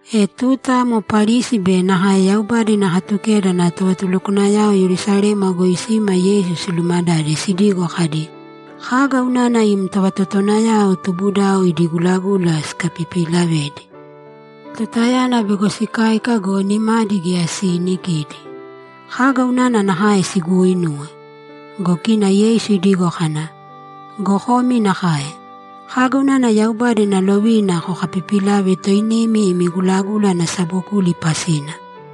E tuta amo Parisi be nakae Yaubada ina Katukeda ana tovatulukwanayao Yerusalema goi sima Yeisu silumadade sidigo kadi, ‘Kaga unana im tovatotowanayao tubudao idi gulagula sikapipilavedi? Tutayana bego sikáika go, nimadi geya siinikidi. Kaga unana nakae siguuinuwe?’ Go kina Yeisu idigo kana, ‘Go komi nakae. Kaga unana Yaubada ina lovina kokapipilave toinimi imi gulagula ana sabokuli pasina?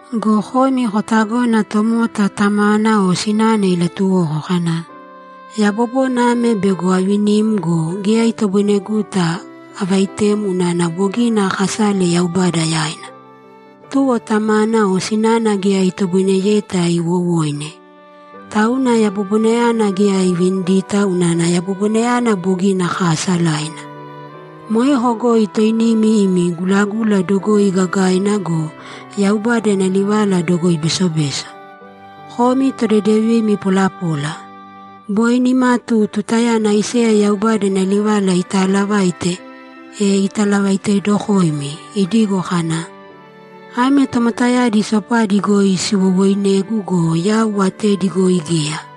Go komi kotagona tomota tamana o sinana ilatuwoko kana, “Yabobona ame bego avinim go, geya itoboineguta avaitem unana bogina akasale Yaubada yaina.” Tuwo tamana o sinana geya itoboineyeta iwowoine. Tauna yabobonayana geya ivinidita unana yabobonayana bogina kaasalaina. Moeko goi toinimi imi gulagula dogoi gagaina go, Yaubada ina livala dogoi besobeso. Komi todedevimi polapola! Boi nimatu tutayana Aiseya Yaubada ina livala itaalavaite, e italavaitedokoimi, idigo kana, “Ame tomotayadi sopadi goi siwowooinegu go, yau atedi goi geya.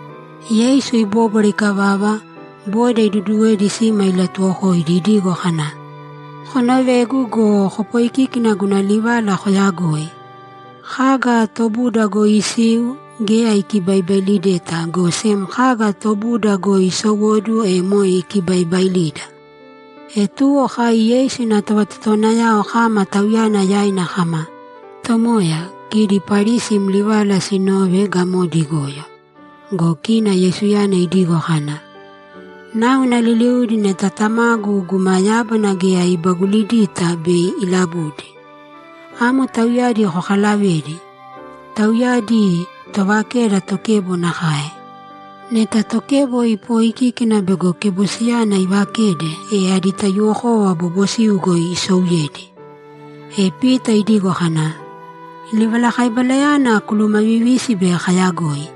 Yeisu ibóbwara ikavava, boda iduduwedi sima ilatuwokoidi idigo kana, ‘Konovēgu go, kopoikīki guna livala koyagoi! Kaga tobuda goi isiu, geya ikibaibailideta, go sem kaga tobuda goi isowóduwo, e moe ikibaibailida.’ E tuwo kai Yeisu ina tovatotowanayao kama Tauyana yaina kama, ‘Tomoya, kidi Parisi im livala sinove, gamodi igoyo.’ Go kina Yeisuyana idigo kana, ‘Náuna liliudi neta Tamagu guma yábana geya ibagulidita bei ilabudi. Amo tauyadi kokalavēdi. Tauyadi tovakeda tokebo nakae. Neta tokebo ipoikíkina bego kebosiyana ivakede, e adi taiyuwokova bobosiu goi isouyedi.’ E Pita idigo kana, ‘Livalakaibalayana kulumavivīsi bei kayagoi.’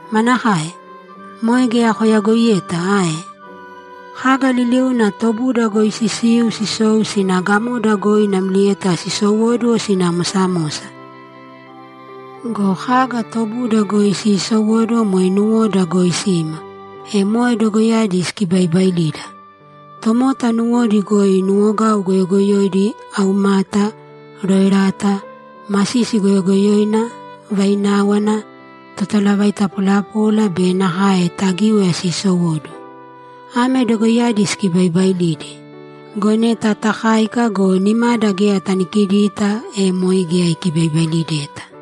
Manakae? Moe geya koyagoiyeta ae? Kaga liliuna tobuda goi sisiu, sisou sina gamoda goi namlieta sisowóduwo sina mosamosa. Go kaga tobuda goi siisowóduwo moe nuwoda goi sima, e moe dogoiyadi sikibaibaailida. Tomota nuwodi goi nuwogau goyogoyoidi, aumata, roerata, masisi goyogoyoina, vaináwana, totalavaita polapola be nakae tagíwaya sisowóduwo. Ame dogoiyadi sikibaibailidi. Go neta takáika go, nimada geya tanikidita, e moe geya ikibaibailideta.’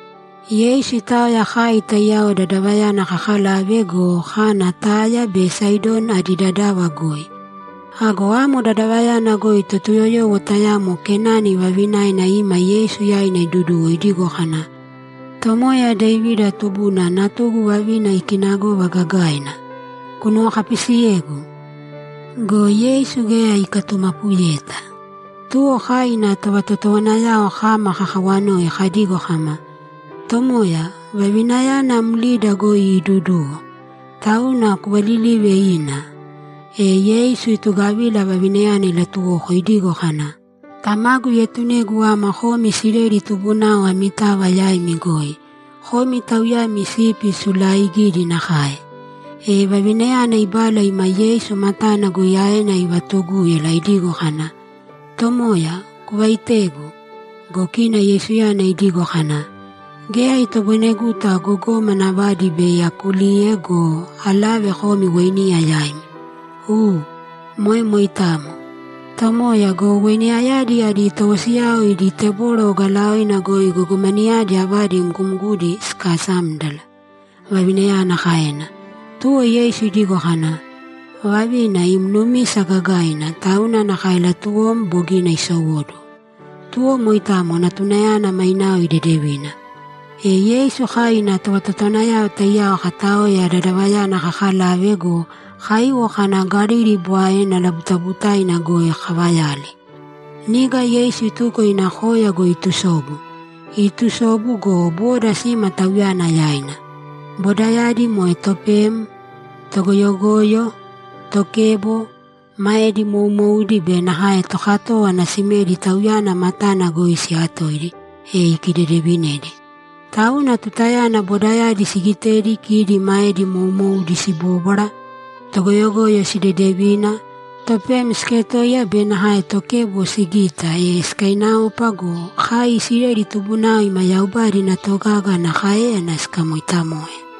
Yeisu itaoya kai taiyao dadavayana kakalave go, kana Taya be Saidoni adi dadava goi. Ago amo dadavayana goi Totuyoyowo tayamo Kenani vavinaina ima Yeisu yaina iduduwo idigo kana, ‘Tomoya Devida tubuna, natugu vavina ikinagova gagaina! Kunuwokapisiyēgu!’ Go Yeisu geya ikatumapuyeta. Tuwo kai ina tovatotowanayao kama kakawanoi kadigo kama, ‘Tomoya, vavinayana mlida goi iiduduwo, tauna kuvalilīve ina.’ E Yeisu itugavila vavinayana ilatuwoko idigo kana, ‘Tamagu ietunegu ama komi Isileli tubunao amitava yaimi goi; komi tauyami sipi sulaaigidi nakae.’ E vavinayana ibala ima Yeisu matana goi aena ivatugúyala idigo kana, ‘Tomoya, kuvaitēgu.’ Go kina Yeisuyana idigo kana, ‘Geya itoboineguta gogómana avadi bei akuliuye go, alave komi weiniya yaimi.’ ‘U, moe moitamo, Tomoya go, weiniyayadi adi towosiyao idi teboro ogalaoina goi gogomanayadi avadi mgumguna sikasámdala’, vavinayana kaena. Tuwo Yeisu idigo kana, ‘Vavina, im numisa gagaina, tauna nakae latuwom bogina isowóduwo.’ Tuwo moitamo natunayana mainao idedevina. E Yeisu kai ina tovatotowanayao taiyao kataoya dadavayana kakalave go, kaiwo kana Galili Bwaena labutabutaina goi kavayali. Niga Yeisu ituko ina koya goi itusobu. Iitusobu go, boda sima Tauyana yaina. Bodayadi moe topem, togoyogoyo, tokebo, maedi moumoudi be nakae tokatówana simedi Tauyana matana goi siyatoidi, e ikidedevinedi. Tauna tutayana bodayadi sigite kidi maedi moumoudi sibóbwara, togoyogoyo sidedevina, topem siketoiya be nakae tokebo sigita, e sikainaopa go, kai Isileli tubunao ima Yaubada ina togaga ana káeyana sikamoitamoe.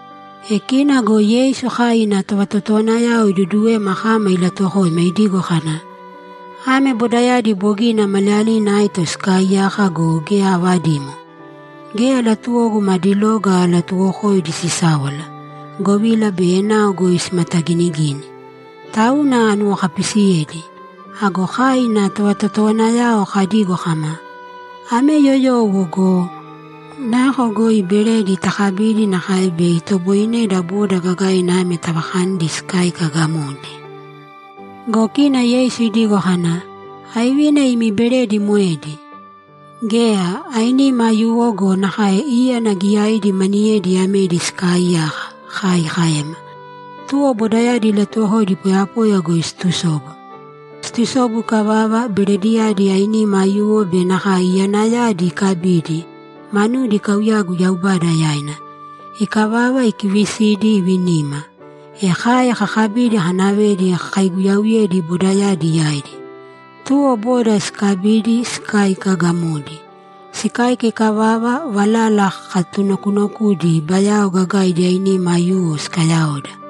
E kina go Yeisu kai ina tovatotowanayao iduduwema kama ilatuwokoima idigo kana, ‘Ame bodayadi bogina maliyalina aito sikaaiyaka go, geya avadimo. Geya latuwogu madi loga alatuwokoidi sisáwala, govila bei enao goi simataginigini. Tauna anuwokapisiyedi.’ Ago kai ina tovatotowanayao kadigo kama, ‘Ame yoyowo go! Nako goi beredi takabidi nakae bei itoboineda boda gagaina ame tavakanidi sikáika gamodi?’ Go kina Yeisu idigo kana, ‘Aivina imi beredi moedi?’ ‘Geya, ainima aiyuwo go, nakae íyana giyaidi maniyedi amedi sikaaiyaka’, kai kaema. Tuwo bodayadi ilatuwokoidi poyapoya goi situsobu. Situsobu ikavava, berediyadi ainima aiyuwo be nakae iyanayadi ikabidi, manudi ikauyagu Yaubada yaina. Ikavava, ikivisidi, ivinima. E kai kakabidi kanavedi kakaiguyauyedi bodayadi yaidi. Tuwo boda sikabidi, sikáika gamodi. Sikáika ikavava, valala kakatunokunokudi, bayao gagaidi ainima aiyuwo sikayaoda.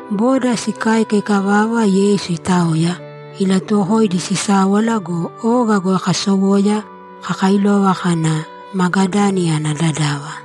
Boda sikáika ikavava, Yeisu itaoya, ilatuwokoidi sisáwala go, oga kasowoya, kakailova kana Magadani ana dadava.